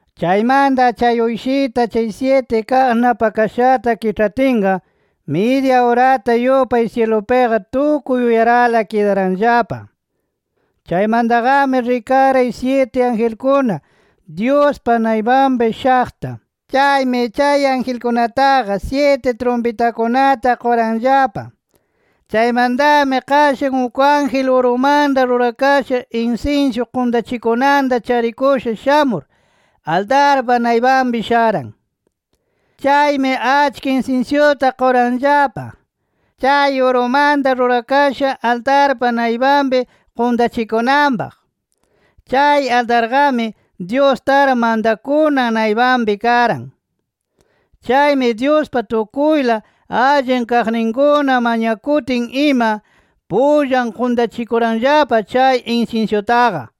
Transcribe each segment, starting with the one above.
Chaymanta chay Uyshita chay syiti kaq napakashata kiĉhatinqa, midya urata yupay syilupiqa tukuy uyarala kidaranllapa. Chaymantaqami, rikaray syiti angelkuna Dyuspa naypanpi shaqta. Chaymi chay angelkunataqa syiti trumpitakunata quranllapa. Chaymantami qashan uk ángel, urumanta rurakasha insinsyu quntachikunanta charikusha shamur, altarpa naypanpi sharan. Chaymi achka insinsyuta quranllapa, chay urumanta rurakasha altarpa naypanpi quntachikunanpaq. Chay altarqami, Dyus tar mantakunan naypanpi karan. Chaymi Dyuspa tukuyla allin kaqninkuna mañakutin ima, pullan quntachikuranllapa chay insinsyutaqa.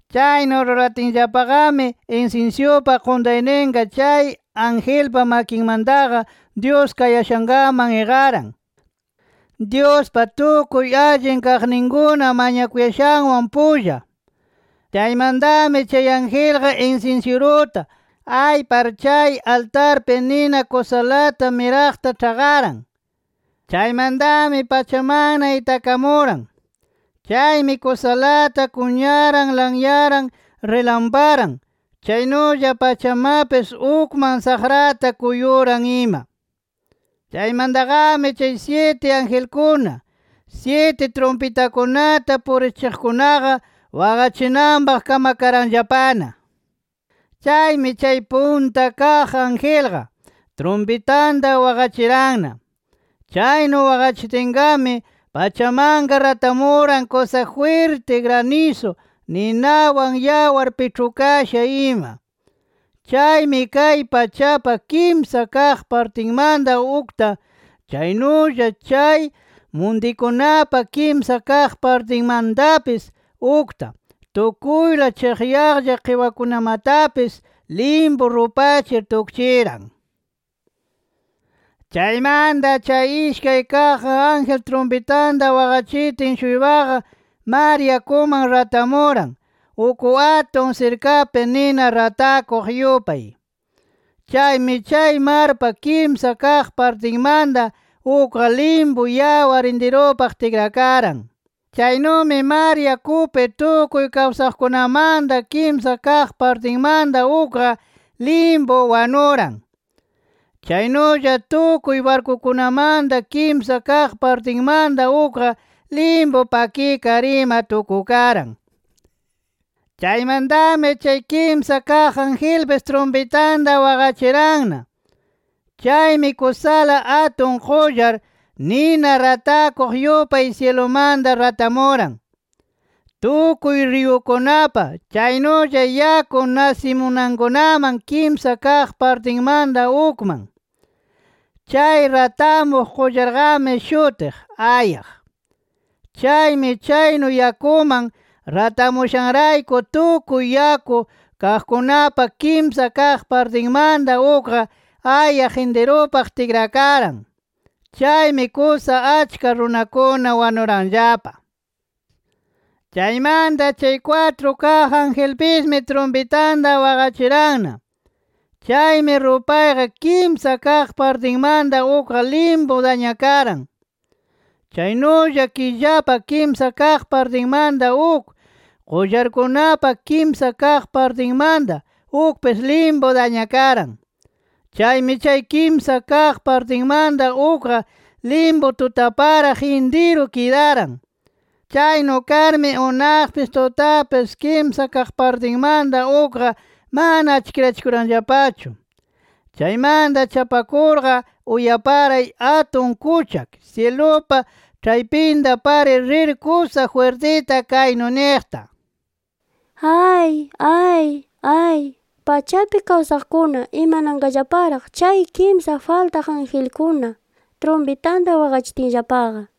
Chaynu ruratinllapaqami, insinsyupa quntayninqa, chay angelpa makinmantaqa Dyus kayashankaman iqaran, Dyuspa tukuy allin kaqninkuna mañakuyashanwan pulla. Chaymantami chay angelqa insinsyiruta aypar, chay altarpi nina kusalata miraqta ĉhaqaran. Chaymantami pachamanna itakamuran. Chaymi kusalata kunyaran, lanyaran, rilamparan, chaynulla pachamapis ukman saqrata kuyuran ima. Chaymantaqami chay syiti angelkuna, syiti trumpitakunata purichiqkunaqa, waqachinanpaq kamakaranllapana. Chaymi chay punta kaq angelqa, trumpitanta waqachiranna. Chaynu waqachitinqami, pachamanqa ratamuran kusa jwirti granisu, ninawan yawar piĉhukasha ima. Chaymi kay pachapa kimsa kaq partinmanta ukta, chaynulla chay muntikunapa kimsa kaq partinmantapis ukta, tukuyla chiqyaqlla qiwakunamatapis limpu rupachir tukchiran. Chaymanta chay ishkay kaq ángel trumpitanta waqachitin-shuypaqa mar yakuman ratamuran, uk atun sirkapi nina ratakuq yupay. Chaymi chay marpa kimsa kaq partinmanta ukqa limpu yawar intirupaq tikrakaran. Chaynumi mar yakupi tukuy kawsaqkunamanta kimsa kaq partinmanta ukqa, limpu wanuran. Chaynulla tukuy barkukunamanta kimsa kaq partinmanta ukqa, limpu pakikar ima tukukaran. Chaymantami chay kimsa kaq angelpis trumpitanta waqachiranna. Chaymi kusala atun qullar, nina ratakuq yupay syilumanta ratamuran, tukuy riyukunapa, chaynulla yaku nasimunankunaman kimsa kaq partinmanta ukman. Chay ratamuq qullarqami shutiq “Ayaq”. Chaymi chaynu yakuman ratamushanrayku tukuy yaku kaqkunapa kimsa kaq partinmanta ukqa, ayaq intirupaq tikrakaran. Chaymi, kusa achka runakuna wanuranllapa. Chaymanta chay kwatru kaq angelpismi trumpitanta waqachiranna. Chaymi rupaypa kimsa kaq partinmanta ukqa limpu dañakaran. Chaynulla killapa kimsa kaq partinmanta uk, qullarkunapa kimsa kaq partinmanta ukpis limpu dañakaran. Chaymi chay kimsa kaq partinmanta ukqa limpu tutaparaq intiru kidaran. Chaynu karmi unaqpis tutapis kimsa kaq partinmanta ukqa mana achkirachikuranllapachu. Chaymanta chapakurqa, uyaparay atun kuchak syilupa ĉhaypinta parir rir kusa jwirtita kaynu niqta: “¡Ay, ay, ay, pachapi kawsaqkuna, imananqallaparaq chay kimsa faltaq angelkuna trumpitanta waqachitinllapaqa!” nir.